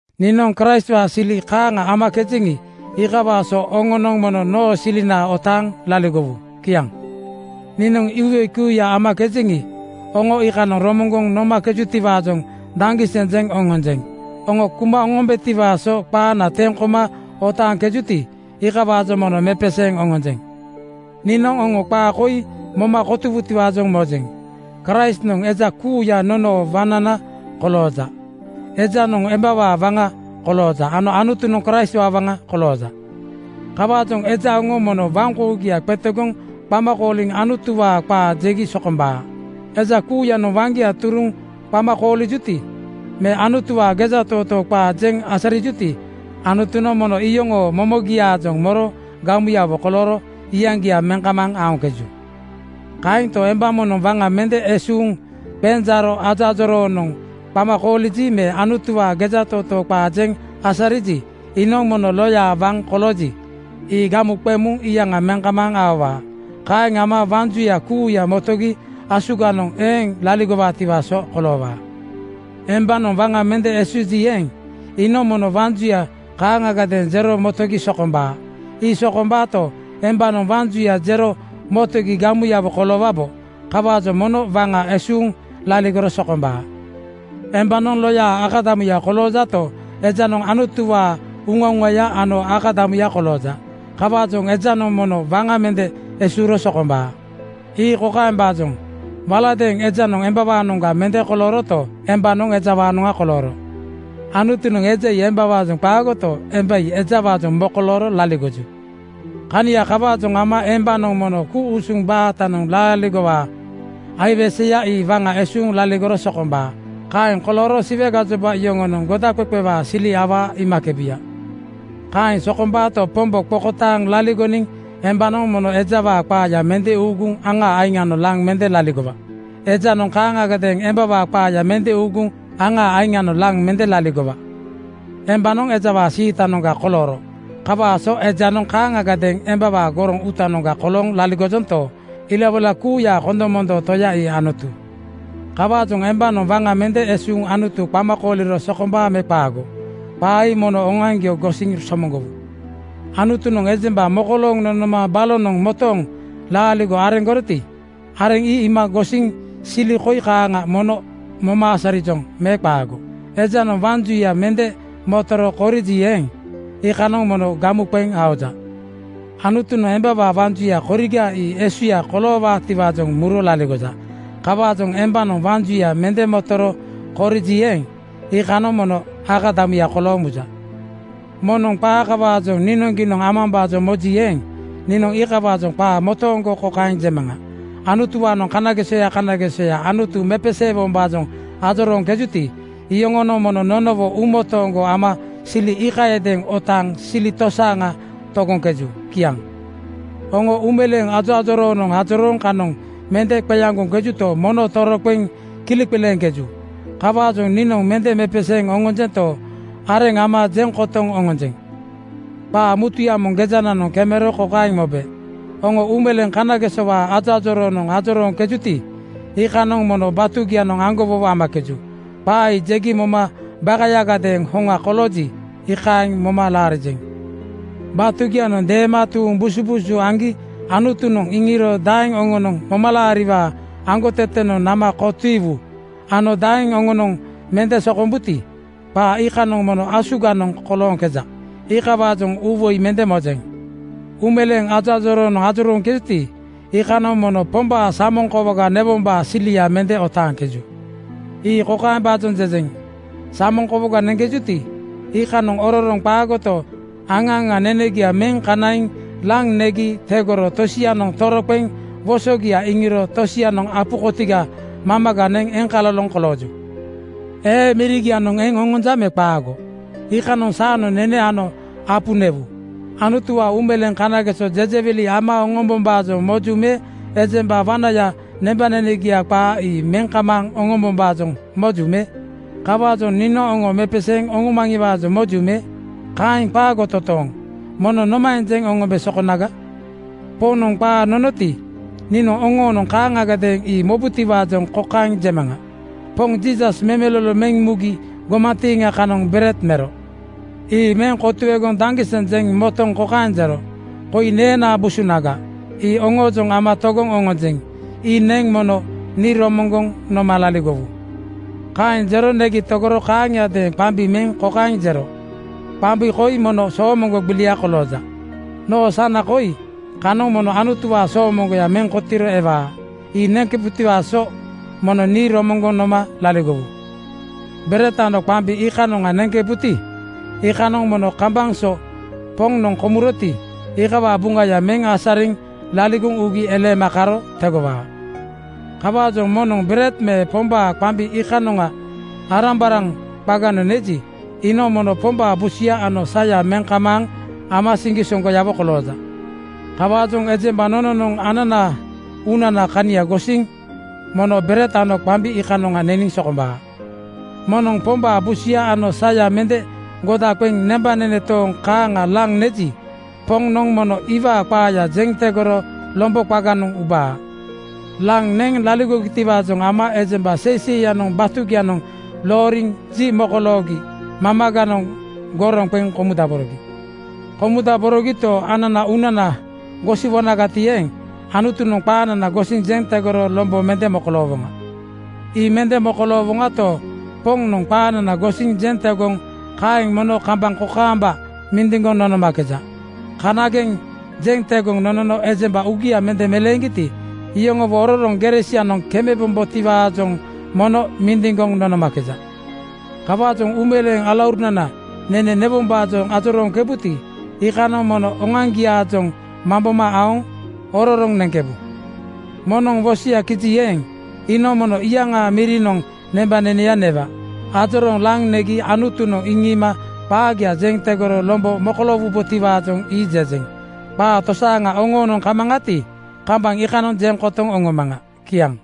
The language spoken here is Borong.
Niinoŋ Kraistwaa sili kaaŋa amakejeŋi, iikawaa so oŋonoŋ mono noo silina otaaŋ laligowu. Kiaŋ. Niinoŋ iwoi kuuya amakejeŋi, oŋo iikanoŋ romoŋgoŋ nomakejutiwaajoŋ daŋgiseŋ jeŋ oŋonjeŋ. Oŋo kuma oŋombetiwaa so qaana teŋ koma otaaŋkejuti, iikawaajoŋ mono mepeseeŋ oŋonjeŋ. Niinoŋ oŋo qaa koi moma kotowutiwaajoŋ mojeŋ: Kraistnoŋ eja kuuya nonoo waŋnana kolooja. Ejanoŋ embawaa waŋa kolooja ano Anutunoŋ Kraistwaa waŋa kolooja. Kawaajoŋ eja oŋo mono waŋkougia qetegoŋ qama kooliŋ Anutuwaa qaa jegi sokombaa. Eja kuuyanoŋ waŋgia turuŋ qama koolijuti, me Anutuwaa gejatootoo qaa jeŋ asarijuti, Anutunoŋ mono iyoŋoo momogiaajoŋ moro gamuyawo kolooro iyaŋgia meŋ kamaaŋ aoŋkeju. Kaento, emba moŋnoŋ waŋa mende esuuŋ qenjaaro ajoajoroonoŋ qama kooliji me Anutuwaa gejatootoo qaa jeŋ asariji, iinoŋ mono loya waŋ kolooji, ii gamu qeŋ muŋ iyaŋa meŋ kamaaŋ aowaa. Kaeŋ ama waŋ juya kuuya motogi asuganoŋ eeŋ laligowaatiwaa so koloowaa. Embanoŋ waŋa mende esuuji eeŋ, iinoŋ mono waŋ juya kaaŋagadeeŋ jero motogi sokombaa. Ii sokombaato, embanoŋ waŋ juya jero motogi gamuyawo koloowabo. Kawaajoŋ mono waŋa esuuŋ laligoro sokombaa. Embanoŋ loyaa akadamuya koloojato, ejanoŋ Anutuwaa uŋauŋaya ano akadamuya kolooja. Kawaajoŋ ejanoŋ mono waŋa mende esuuro sokombaa. Ii kokaembaajoŋ: Waladeeŋ ejanoŋ embanoŋga mende kolooroto, embanoŋ ejawaanoŋa kolooro. Anutunoŋ eja ii embawaajoŋ qaagoto, emba ii ejawaajoŋ mokolooro laligoju. Kania kawaajoŋ ama embanoŋ mono ku-usuŋ baatanoŋ laaligowaa aiweseya ii waŋa esuuŋ laligoro sokombaa. Kaeŋ kolooro Siwe gajoba yoŋonoŋ godaqeqewaa sili awaa iimakebu. Kaeŋ sokombaato, Pombo qokotaaŋ laligoniŋ embanoŋ mono ejawaa qaaya mende uuguŋ aŋaa aiŋanoŋ laŋ mende laligowa. Ejanoŋ kaaŋagadeeŋ embawaa qaaya mende uuguŋ aŋaa aiŋanoŋ laŋ mende laligowa. Embanoŋ ejawaa siitanoŋga kolooro kawaa so ejanoŋ kaaŋagadeeŋ embawaa goroŋ uutanoŋga kolooŋ laligojonto, ilawoila kuuyaa kondomondoo Toya ii Anutu. Kawaajoŋ embanoŋ waŋa mende esuuŋ Anutu qama kooliro sokombaa me qaago? Qaa ii mono oŋoaŋgio gosiŋ somoŋgowu. Anutunoŋ ejemba mokolooŋ nonoma balonoŋ motooŋ laaligo areŋgoroti, areŋ ii iima gosiŋ sili koi kaaŋa mono moma asarijoŋ me qaago? Ejanoŋ waŋ juya mende motoro koriji eeŋ, iikanoŋ mono gamu qeŋ aoja. Anutunoŋ embawaa waŋ juya koriga ii esuya koloowaatiwaajoŋ muro laligoja. Kawaajoŋ embanoŋ waŋ juya mende motoro koriji eeŋ, iikanoŋ mono akadamuya kolooŋ muja. Moŋnoŋ qaa kawaajoŋ niinoŋgiinoŋ amambaajoŋ moji eeŋ, niinoŋ iikawaajoŋ qaa motooŋgo kokaeŋ jemaŋa: Anutuwaanoŋ kanagesoya kanagesoya Anutu mepeseewombaajoŋ ajorooŋkejuti, iyoŋonoŋ mono nonowo uumotooŋgo ama sili iikayadeeŋ otaaŋ sili tosaaŋa togoŋkeju. Kiaŋ. Oŋo uumeleeŋ ajoajoroonoŋ ajorooŋ kanoŋ mende qeaŋgoŋkejuto, mono toroqeŋ kileqileeŋkeju. Kawaajoŋ niinoŋ mende mepeseeŋ oŋonjento, areŋ ama jeŋ kotoŋ oŋonjeŋ. Qaa mutuya moŋ gejananoŋ kemero kokaeŋ mobe, “Oŋo uumeleeŋ kanagesowaa ajoajoroonoŋ ajorooŋkejuti, iikanoŋ mono batugianoŋ aŋgowowo amakeju.” Qaa ii jegi moma bakayagadeeŋ hoŋa kolooji, iikaeŋ moma laarijeŋ. Batugianoŋ deema tuuŋ busubuusu aŋgi Anutunoŋ iŋiiro daeŋ oŋonoŋ momalaariwaa aŋgotetenoŋ nama kotiiwu ano daeŋ oŋonoŋ mende sokombuti, qaa iikanoŋ mono asuganoŋ kolooŋkeja. Iikawaajoŋ uuwoi mende mojeŋ. Uumeleeŋ ajoajoroonoŋ ajorooŋkejuti, iikanoŋ mono Pombaa samoŋ kowoga newombaa silia mende otaaŋkeju. Ii kokaembaajoŋ jejeŋ: Samoŋ kowoga neŋkejuti, iikanoŋ ororoŋ qaagoto, aŋa aŋa nenegia meŋ kanaiŋ laŋ negi tegoro tosianoŋ toroqeŋ wosogia iŋiro tosianoŋ apu kotiga mamaga neŋ eŋkaloloŋ kolooju. Ee mirigia eŋ oŋonja me qaago? Iikanoŋ saanoŋ nene ano apu newu. Anutuwaa uumeleeŋ kanageso jejewili ama oŋombombaajoŋ moju me ejemba wanaya nembanenegia qaa ii meŋ kamaaŋ oŋombombaajoŋ moju me? Kawaajoŋ niinoŋ oŋo mepeseeŋ oŋomaŋiwaajoŋ moju me? Kaeŋ qaago totooŋ. Mono nomaeŋ jeŋ oŋombe sokonaga? Poŋnoŋ qaa nonoti, niinoŋ oŋonoŋ kaaŋagadeeŋ ii mobutiwaajoŋ kokaeŋ jemaŋa: Poŋ Jiisas memelolo meŋ mugi gomantiiŋa kanoŋ bered mero. Ii meŋ kotuegoŋ daŋgiseŋ jeŋ motoŋ kokaeŋ jero, “Koi neenaa busunaga. Ii oŋoojoŋ ama togoŋ oŋonjeŋ. Ii neŋ mono nii romoŋgoŋ noma laligowu.” Kaeŋ jero negi tegoro kaaŋiadeeŋ qambi meŋ kokaeŋ jero, “Qambi koi mono soomoŋgo gbilia kolooja. Noo sana koi kanoŋ mono Anutuwaa soomoŋgoya meŋ kotiiro ewaa. Ii neŋkebutiwaa so mono nii romoŋgoŋ noma laligowu.” Bered ano qambi iikanoŋa neŋkebuti, iikanoŋ mono kambaŋ so Poŋnoŋ komuroti, iikawaa buŋaya meŋ asariŋ laligoŋ ugi eleema karo tegowaa. Kawaajoŋ moŋnoŋ bered me Pombaa qambi iikanoŋa arambaraŋ qaganoŋ neji, iinoŋ mono Pombaa busuya ano saya meŋ kamaaŋ ama siŋgisoŋgoyawo kolooja. Kawaajoŋ ejemba nononoŋ ananaa uunanaa kania gosiŋgo mono bered ano qambi iikanoŋa neniŋ sokombaa. Moŋnoŋ Pombaa busuya ano saya mende goda qeŋ nembanene tooŋ kaaŋa laŋ neji, Poŋnoŋ mono iwaa qaaya jeŋ tegoro lombo qaganoŋ ubaa. Laŋ neŋ laligogitiwaajoŋ ama ejemba seiseiyanoŋ batugianoŋ looriŋ ji mokoloogi mamaganoŋ goroŋ qeŋ komudaborogi. Komudaborogito, ananaa uunana gosiwonagati eeŋ, Anutunoŋ qaanana gosiŋ jeŋ tegoro lombo mende mokoloowoŋa. Ii mende mokoloowoŋato, Poŋnoŋ qaanana gosiŋ jeŋ tegoŋ kaeŋ mono kambaŋ kokaamba mindiŋgoŋ nonomakeja. Kanageŋ jeŋ tegoŋ nonono ejemba uugia mende meleeŋgiti, iyoŋowo ororoŋ gere sianoŋ kemebombotiwaajoŋ mono mindiŋgoŋ nonomakeja. Kawaajoŋ uumeleeŋ alauruna, nene newombaajoŋ ajorooŋkebuti, iikanoŋ mono oŋoaŋgiaajoŋ mamboma aoŋ ororoŋ neŋkebu. Moŋnoŋ wosoya kiji eeŋ, iinoŋ mono iyaŋaa mirinoŋ nembaneneya newa. Ajorooŋ laŋ negi Anutunoŋ iŋiima qaagia jeŋ tegoro lombo mokoloowubotiwaajoŋ ii jejeŋ. Qaa tosaaŋa oŋoonoŋ kamaŋati, kambaŋ iikanoŋ jeŋ kotoŋ oŋomaŋa. Kiaŋ.